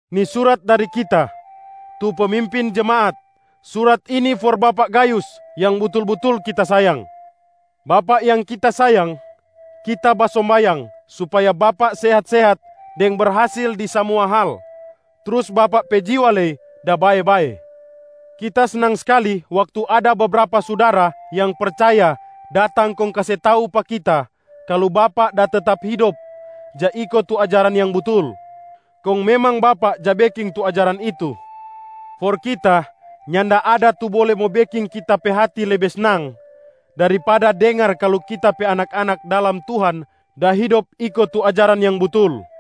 Ni surat dari kita, tu pemimpin jemaat. Surat ini for bapak Gayus yang butul-butul kita sayang. Bapak yang kita sayang, kita basombayang supaya bapak sehat-sehat deng berhasil di samua hal, trus bapak pe jiwa lei da bae-bae. Kita snang skali waktu ada bebrapa sudara yang percaya datang kong kase tau pa kita kalu bapak da tetap hidop ja iko tu ajaran yang butul, kong memang bapak ja beking tu ajaran itu. For kita, nyanda ada tu bole mo beking kita pe hati lebe snang daripada dengar kalu kita pe anak-anak dalam Tuhan da hidop iko tu ajaran yang butul.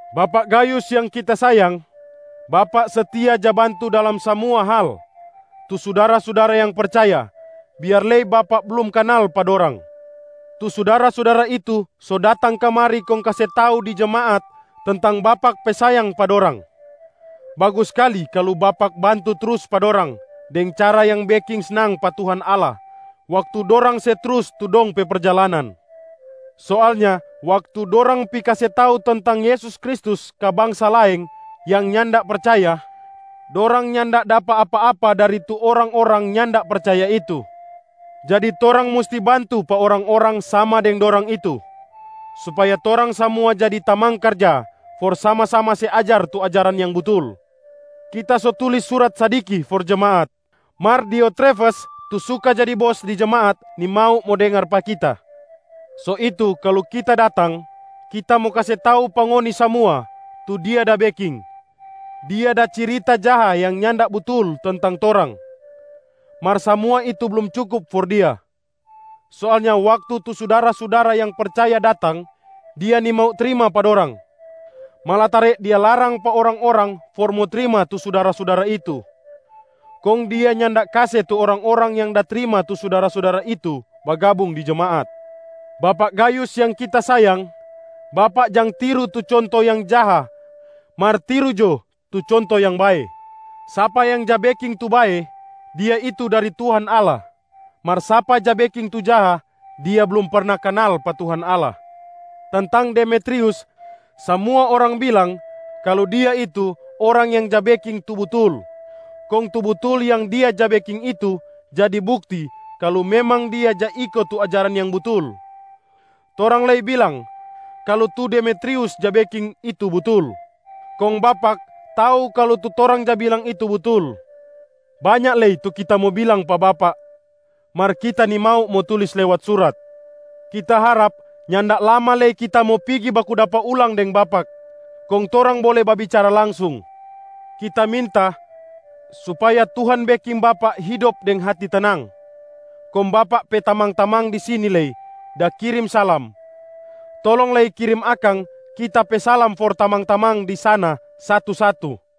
Bapak Gayus yang kita sayang, bapak setia ja bantu dalam samua hal tu sudara-sudara yang percaya, biar lei bapak blum kanal pa dorang. Tu sudara-sudara itu so datang kamari kong kase tau di jemaat tentang bapak pe sayang pa dorang. Bagus skali kalu bapak bantu trus pa dorang deng cara yang beking snang pa Tuhan Allah waktu dorang se trus tu dong pe perjalanan. Soalnya waktu dorang pi kase tau tentang Yesus Kristus ka bangsa laeng yang nyanda percaya, dorang nyanda dapa apa-apa dari tu orang-orang nyanda percaya itu. Jadi torang musti bantu pa orang-orang sama deng dorang itu, supaya torang samua jadi tamang karja for sama-sama se ajar tu ajaran yang butul. Kita so tulis surat sadiki for jemaat, mar Diotrefes tu suka jadi bos di jemaat nimau mo dengar pa kita. So itu kalu kita datang, kita mo kase tau pa ngoni samua tu dia da beking. Dia da cirita jaha yang nyanda butul tentang torang. Mar samua itu blum cukup for dia. Soalnya waktu tu sudara-sudara yang percaya datang, dia nimau trima pa dorang. Malatare dia larang pa orang-orang for mo trima tu sudara-sudara itu, kong dia nyanda kase tu orang-orang yang da trima tu sudara-sudara itu bagabung di jemaat. Bapak Gayus yang kita sayang, bapak jang tiru tu conto yang jaha mar tiru jo tu conto yang bae. Sapa yang ja beking tu bae, dia itu dari Tuhan Allah. Mar sapa ja beking tu jaha, dia blum perna kanal pa Tuhan Allah. Tentang Demetrius, samua orang bilang kalu dia itu orang yang ja beking tu butul. Kong tu butul yang dia ja beking itu jadi bukti kalu memang dia ja iko tu ajaran yang butul. Torang lei bilang kalu tu Demetrius ja beking itu butul, kong bapak tau kalu tu torang ja bilang itu butul. Banya lei tu kita mo bilang pa bapak, mar kita nimau mo tulis lewat surat. Kita harap nyanda lama lei kita mo pigi baku dapa ulang deng bapak, kong torang bole babicara langsung. Kita minta supaya Tuhan beking bapak hidop deng hati tenang. Kong bapak pe tamang-tamang di sini lei da kirim salam. Tolong lei kirim akang kita pe salam for tamang-tamang di sana satu-satu.